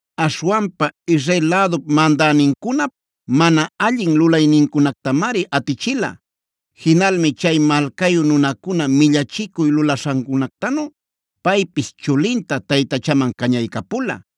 Aśhwanpa Israel lädup mandänincunap mana allin lulaynincunactamari atichila. Jinalmi chay malcayu nunacuna millachicuy lulaśhancunactanu paypis chulinta taytachaman cañaycapula.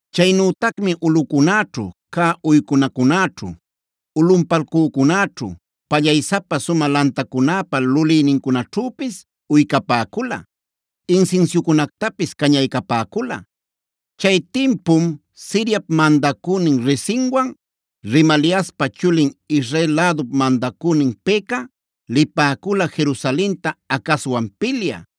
Chaynütacmi ulꞌucunäćhu cä uycunacunäćhu, ulꞌunpalcücunäćhu, pallaysapa sumä lantacunäpa lulïnincunaćhüpis uycapäcula, insinsiucunactapis cañaycapäcula. Chay timpum Siriap mandacünin Rezinwan Remaliaspa chulin Israel lädup mandacünin Peka lipäcula Jerusalenta Acazwan pilyä.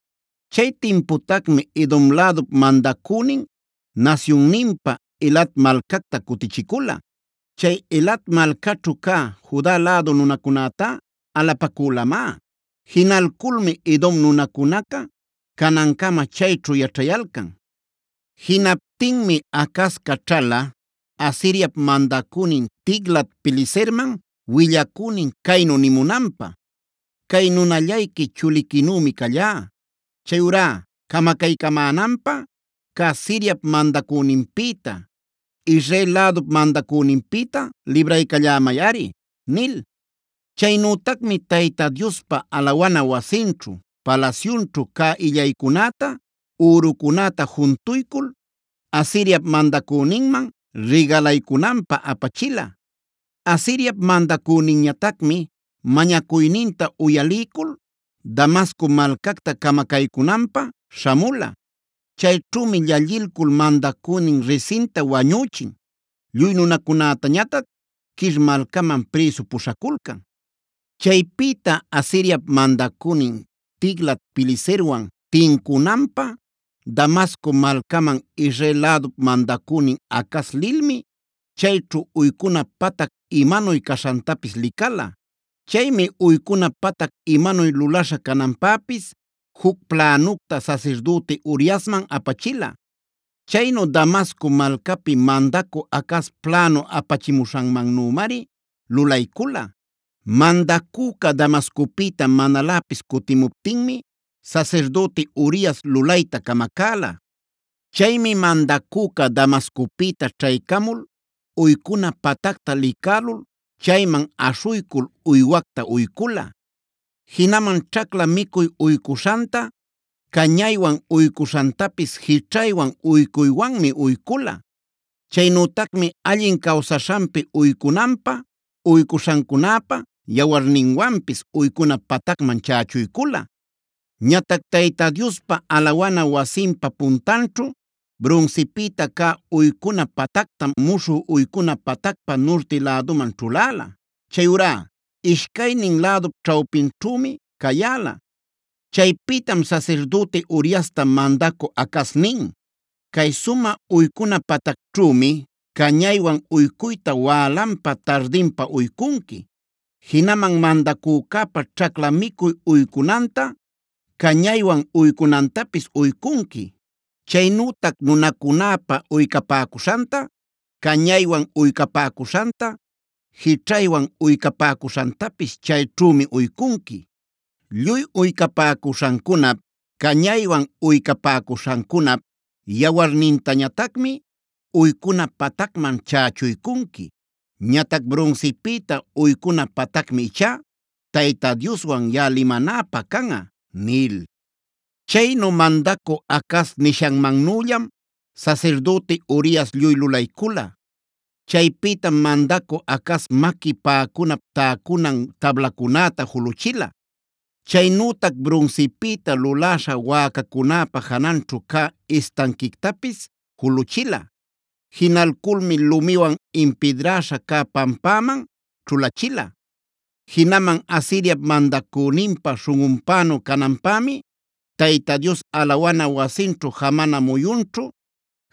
Chay timputacmi Edom lädup mandacünin nasyunninpä Elat malcacta cutichicula. Chay Elat malcaćhu cä Juda lädu nunacunätá alapacülamá. Jinalculmi Edom nunacunaca canancama chayćhu yaćhayalcan. Jinaptinmi Acaz caćhala Asiriap mandacünin Tiglat-pileserman willacünin caynu nimunanpä: “Cay nunallayqui chuliquinümi callá. Chayurá camacaycämänanpä cä Siriap mandacüninpïta, Israel lädup mandacüninpïta libraycallämayꞌari” nil. Chaynütacmi Tayta Diospa alawana wasinćhu, palasyunćhu cä illaycunäta, ürucunäta juntuycul Asiriap mandacüninman rigalaycunanpä apachila. Asiriap mandacüninñatacmi mañacuyninta uyaliycul Damasco malcacta camacaycunanpä śhamula. Chayćhümi llallilcul mandacünin Rezinta wañüchin, lluy nunacunätañatac Kir malcaman prïsu puśhaculcan. Chaypïta Asiriap mandacünin Tiglat-pileserwan tincunanpä Damasco malcaman Israel lädup mandacünin Acaz lilmi chayćhu uycuna patac imanuy caśhantapis licala. Chaymi uycuna patac imanuy lulaśha cananpäpis juc plänucta sasirdüti Uriasman apachila. Chaynu Damasco malcapi mandacü Acaz plänu apachimuśhanmannümari lulaycula. Mandacüca Damascopïta manaläpis cutimuptinmi sasirdüti Urias lulayta camacäla. Chaymi mandacüca Damascopïta ćhaycamul uycuna patacta licälul chayman aśhuycul uywacta uycula. Jinaman ćhacla micuy uycuśhanta, cañaywan uycuśhantapis jićhaywan uycuywanmi uycula. Chaynütacmi allin cawsaśhanpi uycunanpä uycuśhancunäpa yawarninwanpis uycuna patacman chächuycula. Ñatac Tayta Diospa alawana wasinpa puntanćhu brunsipïta cä uycuna patactamc muśhü uycuna patacpa nurti lädunman ćhuläla. Chayurá ishcaynin lädup ćhawpinćhümi cayäla. Chaypïtam sasirdüti Uriasta mandacü Acaz nin: “Cay sumä uycuna patacćhümi cañaywan uycuyta wälanpa tardinpa uycunqui. Jinaman mandacücäpa ćhacla micuy uycunanta, cañaywan uycunantapis uycunqui. Chaynütac nunacunäpa uycapäcuśhanta, cañaywan uycapäcuśhanta, jićhaywan uycapäcuśhantapis chayćhümi uycunqui. Lluy uycapäcuśhancunap, cañaywan uycapäcuśhancunap yawarnintañatacmi uycuna patacman chächuycunqui. Ñatac brunsipïta uycuna patacmi ichá Tayta Dioswan yaꞌa limanäpä canꞌa” nil. Chaynu mandacü Acaz nishanmannüllam sasirdüti Urias lluy lulaycula. Chaypïtam mandacü Acaz maqui päcunap täcunan tablacunäta juluchila. Chaynütac brunsipïta luläśha wäcacunäpa jananćhud cä istanquictapis juluchila. Jinalculmi lumiwan impidräśha cä pampäman ćhulachila. Jinaman Asiriap mandacüninpa śhunꞌunpänu cananpämi Tayta Dios alawana wasinćhu jamana muyunćhu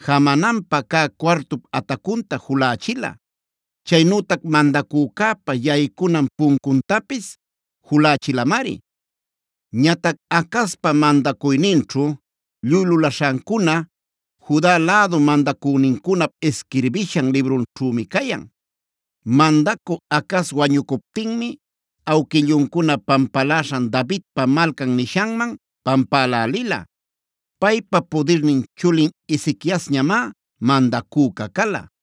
jamananpä cä cuartup atacunta julächila. Chaynütac mandacücäpa yaycunan puncuntapis julächilamari. Ñatac Acazpa mandacuyninćhu lluy lulaśhancuna Juda lädu mandacünincunap isquirbishan librunćhümi cayan. Mandacü Acaz wañucuptinmie awquilluncuna pampaläśhan Davidpa Malcan nishanman pampälälila. Paypa pudirnin chulin Ezequiasñamá mandacüca cala.